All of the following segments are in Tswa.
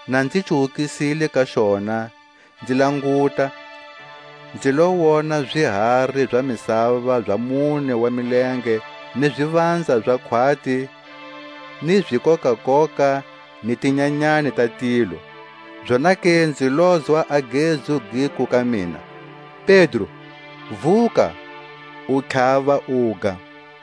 Na nzi cuwukisile ka xona, nzi languta, nzi lo wona zihari za misava za mune wa milenge ni zivanza za khwati, ni zikokakoka ni tinyanyani ta tilo. Zonake nzi lozwa a gezu giku ka mina: Pedro, vuka, u tlhava uga.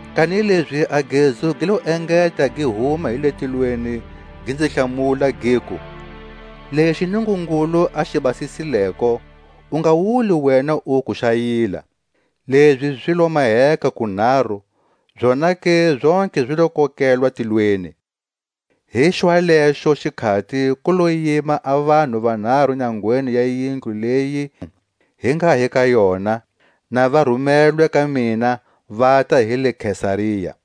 Kanilezi a gezu gi lo engeta gi huma hi le tilweni, gi nzi hlamula, giku: Lexi Nungungulu a xi basisileko, u nga wuli wena uku xa yila. Lezi zi lo maheka kunharu; zonake zontlhe zi lo kokelwa tilweni. Hi xwalexo xikhati ku lo yima a vanhu vanharu nyangweni ya yindlu leyi hi nga hi ka yona, na va rumelwe ka mina vata hi le Kesaria,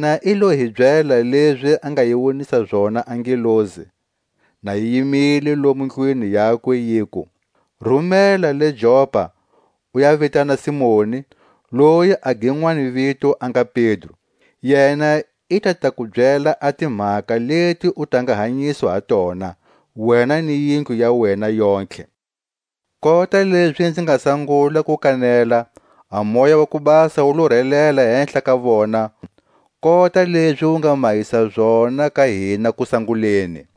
Yena i lo hi byela lezi a nga yi wonisa zona a ngelosi, na yi yimile lomo ndlwini yakwe, yiku: Rumela le Jopa, u ya vitana Simoni, loyi a ginwani vito a nga Pedro; yena i ta ta ku byela a timhaka leti u ta nga hanyiswa ha tona, wena ni yindlu ya wena yontlhe. Kota lezi nzi nga sangula ku kanela, a Moya wa ku Basa wu lo relela hehla ka vona, kota lezi wu nga mahisa zona ka hina kusanguleni.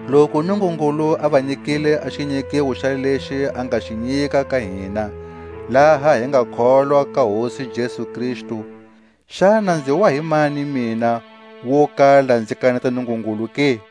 Loku Nungungulu a va nyikile a xinyikiwo xalexi a nga xi nyika ka hina, laha hi nga kholwa ka Hosi Jesu Kristu, xana nzi wa hi mani mina, wo kala nzi kaneta Nungungulu ke?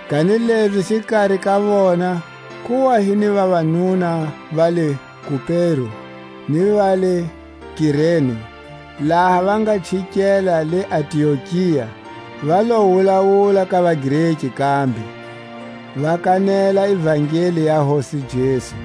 Kanilezi xikari ka vona ku wa hi ni vavanuna va le Kupero ni va le Kirene; laha va nga chikela le Antiokia va lo wulawula ka vaGreki kambe, va kanela ivangeli ya Hosi Jesu.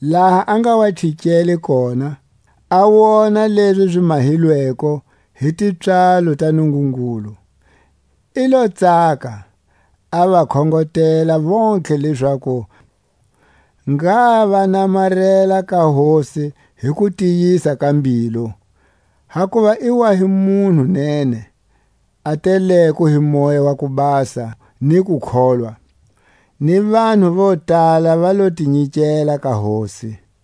Laha a nga wa chikele kona, a wona lezi zi mahilweko hi tipswalo ta Nungungulu, i lo tsaka; a va khongotela vontlhe lezaku ngha va namarela ka Hosi hi kutiyisa ka mbilu. Kakuva i wa hi munhu nene, a teleko hi Moya wa ku Basa ni kukholwa; ni vanhu vo tala va lo ti nyikela ka Hosi.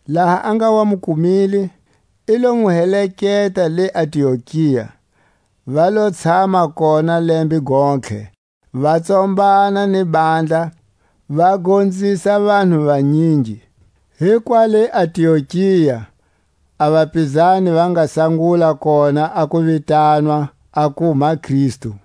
Laha a nga wa mu kumile, i lo mu heleketa le Antiokia. Va lo tshama kona lembe gontlhe va tsombana ni handla, va gonzisa vanhu vanyingi. Hi kwa le Antiokia a vapizani va nga sangula kona a ku vitanwa aku maKristu.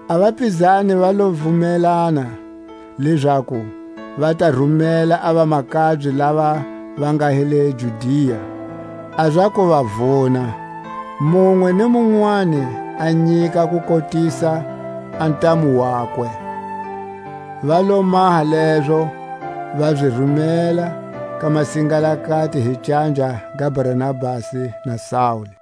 A vapizani va lo vumelana, lezaku va ta rumela a vamakabye lava va nga hi le Judia a za ku va vuna, munwe ni munwani a nyika kukotisa a ntamu wakwe. Va lo maha lezo, va zi rumela ka masingalakati hi canja ga Barnabasi na Saule.